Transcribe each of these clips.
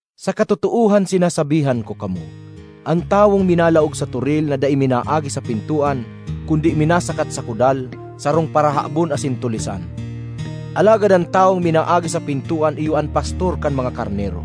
”Sa katotoohan sinasabihan ko kamo, an tawong minalaog sa toril na dai minaagi sa pintoan kundi minasakat sa kudal, sarong parahabon asin tulisan. Alagad an tawong minaagi sa pintoan iyo an pastor kan mga karnero.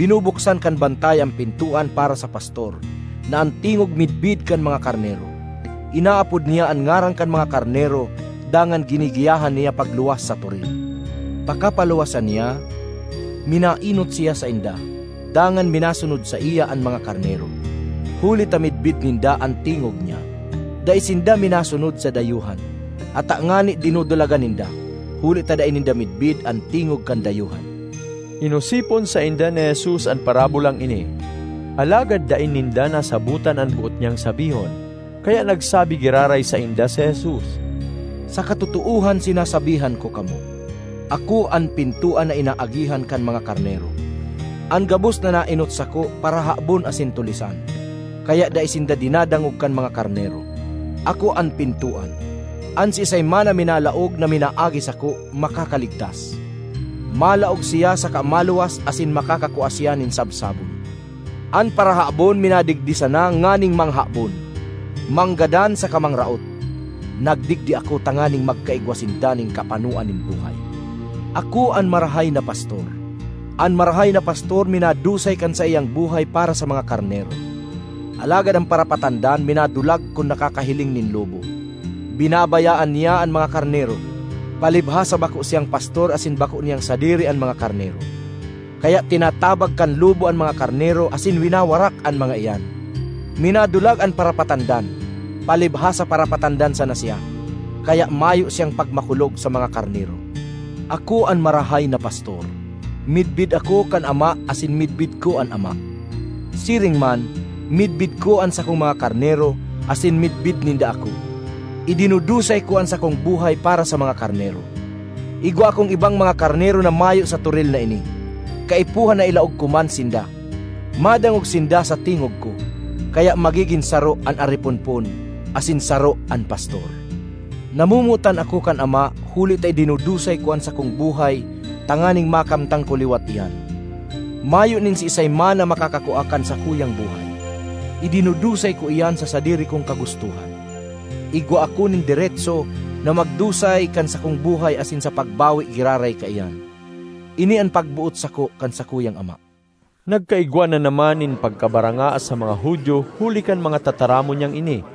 Binubuksan kan bantay an pintoan para sa pastor na an tingog midbid kan mga karnero. Inaapod niya an ngaran kan mga karnero dangan ginigiyahan niya pagluwas sa toril. Pakapaluwasa niya, minaenot siya sainda, dangan minasunod saiya an mga karnero, huli ta midbid ninda an tingog niya. Dai sinda minasunod sa dayuhan, ata ngani dinudulagan ninda, huli ta dai ninda midbid an tingog kan dayuhan.” Inosipon sainda ni Jesus an parabolang ini, alagad dai ninda nasabotan an boot niyang sabihon. Kaya nagsabi giraray sainda si Jesus, “Sa katotoohan sinasabihan ko kamo, ako an pintoan na inaagihan kan mga karnero. An gabos na naenot sako parahabon asin tulisan, kaya dai sinda dinadangog kan mga karnero. Ako an pintoan; an siisay man na minalaog na minaagi sako, makakaligtas; malaog siya saka maluwas asin makakakua siya nin sabsabon. An parahabon minadigdi sana nganing manghabon, manggadan saka mangraot. Nagdigdi ako tanganing magkaigwa sinda nin kapanoan nin buhay. ”Ako an marahay na pastor. An marahay na pastor minadusay kan saiyang buhay para sa mga karnero. Alagad an parapatandan minadulag kun nakakahiling nin lobo. Binabayaan niya an mga karnero, palibhasa bako siyang pastor asin bako niyang sadiri an mga karnero. Kaya tinatabag kan lobo an mga karnero asin winawarak an mga iyan. Minadulag an parapatandan, palibhasa parapatandan sana siya, kaya mayo siyang pagmakulog sa mga karnero. Ako an marahay na pastor. Midbid ako kan Ama asin midbid ko an Ama; siring man, midbid ko an sakong mga karnero asin midbid ninda ako. Idinudusay ko an sakong buhay para sa mga karnero. Igwa akong ibang mga karnero na mayo sa toril na ini. Kaipuhan na ilaog ko man sinda; madangog sinda sa tingog ko. Kaya magigin saro an ariponpon asin saro an pastor. ”Namomotan ako kan Ama huli ta idinudusay ko an sakong buhay tanganing makamtan ko liwat iyan. Mayo nin siisay man na makakakua kan sakuyang buhay. Idinudusay ko iyan sa sadiri kong kagustohan. Igwa ako nin deretso na magdusay kan sakong buhay asin sa pagbawi giraray kaiyan. Ini an pagboot sako kan sakuyang Ama.” Nagkaigwa na naman nin pagkabaranga sa mga Judio huli kan mga tataramon niyang ini.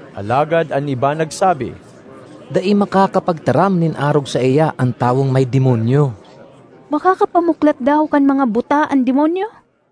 Alagad an iba nagsabi, “Dai makakapagtaram nin arog saiya an tawong may demonyo. Makakapamuklat daw kan mga buta an demonyo?”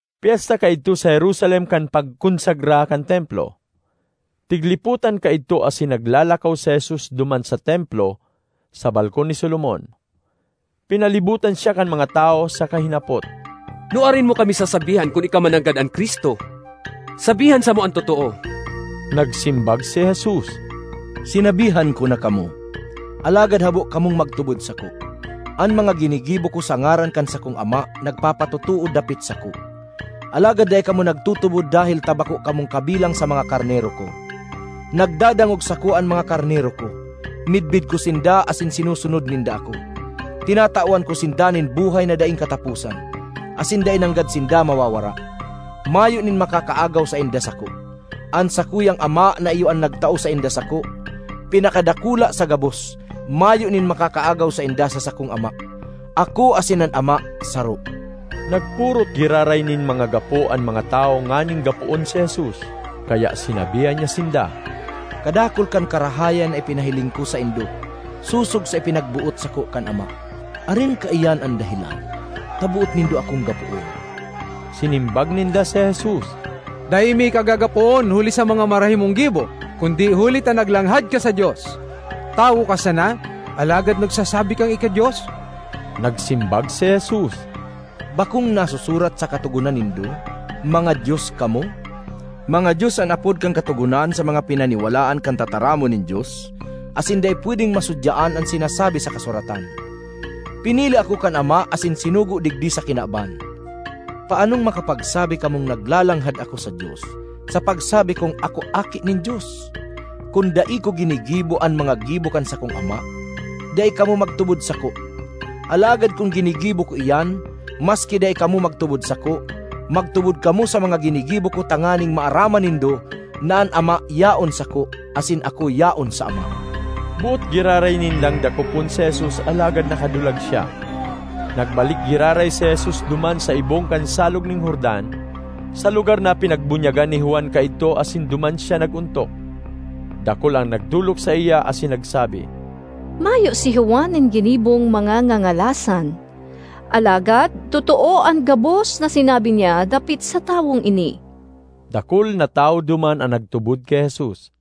Pyesta kaidto sa Jerusalem kan Pagkonsagra kan Templo. Tiglipotan kaidto asin naglalakaw si Jesus duman sa Templo, sa Balkon ni Solomon. Pinalibotan siya kan mga tawo saka hinapot, “Nuarin mo kami sasabihan kun ika mananggad an Cristo? Sabihan samo an totoo.” Nagsimbag si Jesus, “Sinabihan ko na kamo, alagad habo kamong magtubod sako. An mga ginigibo ko sa ngaran kan sakong Ama nagpapatotoo dapit sako. Alagad dai kamo nagtutubod dahel ta bako kamong kabilang sa mga karnero ko. Nagdadangog sako an mga karnero ko; midbid ko sinda asin sinusunod ninda ako. Tinatawan ko sinda nin buhay na daing kataposan, asin dai nanggad sinda mawawara; mayo nin makakaagaw sainda sako. An sakuyang Ama na iyo an nagtao sainda sako, pinakadakula sa gabos; mayo nin makakaagaw sainda sa sakong Ama. Ako asin an Ama saro.” Nagpurot giraray nin mga gapo an mga tawo nganing gapoon si Jesus. Kaya sinabihan niya sinda, “Kadakul kan karahayan na ipinahiling ko saindo sosog sa ipinagboot sako kan Ama; arin kaiyan an dahelan ta boot nindo akong gapoon?” Sinimbag ninda si Jesus, “Dai mi ika gagapoon huli sa mga marhay mong gibo, kundi huli ta naglanghad ka sa Dios! Tawo ka sana, alagad nagsasabi kang ika Dios!” Nagsimbag si Jesus, “Bakong nasusurat sa Katogonan nindo, ‘Mga dios kamo?’ Mga dios an apod kan Katogonan sa mga pinaniwalaan kan tataramon nin Dios asin dai pwedeng masudyaan an sinasabi sa kasuratan. Pinili ako kan Ama asin sinugo digdi sa kinaban. Paanong makapagsabi kamong naglalanghad ako sa Dios sa pagsabi kong Aki ako nin Dios? Kun dai ko ginigibo an mga gibo kan sakong Ama, dai kamo magtubod sako. Alagad kun ginigibo ko iyan, maski dai kamo magtubod sako, magtubod kamo sa mga ginigibo ko tanganing maaraman nindo na an Ama yaon sako asin ako yaon sa Ama.” Boot giraray nindang dakopon si Jesus, alagad nakadulag siya. Nagbalik giraray si Jesus duman sa ibong kan Salog nin Jordan, sa lugar na pinagbunyagan ni Juan kaidto asin duman siya nag-ontok. Dakul an nagdolok saiya asin nagsabi, “Mayo si Juan nin ginibong mga ngangalasan, alagad totoo an gabos na sinabi niya dapit sa tawong ini.” Dakul na tawo duman an nagtubod ki Jesus.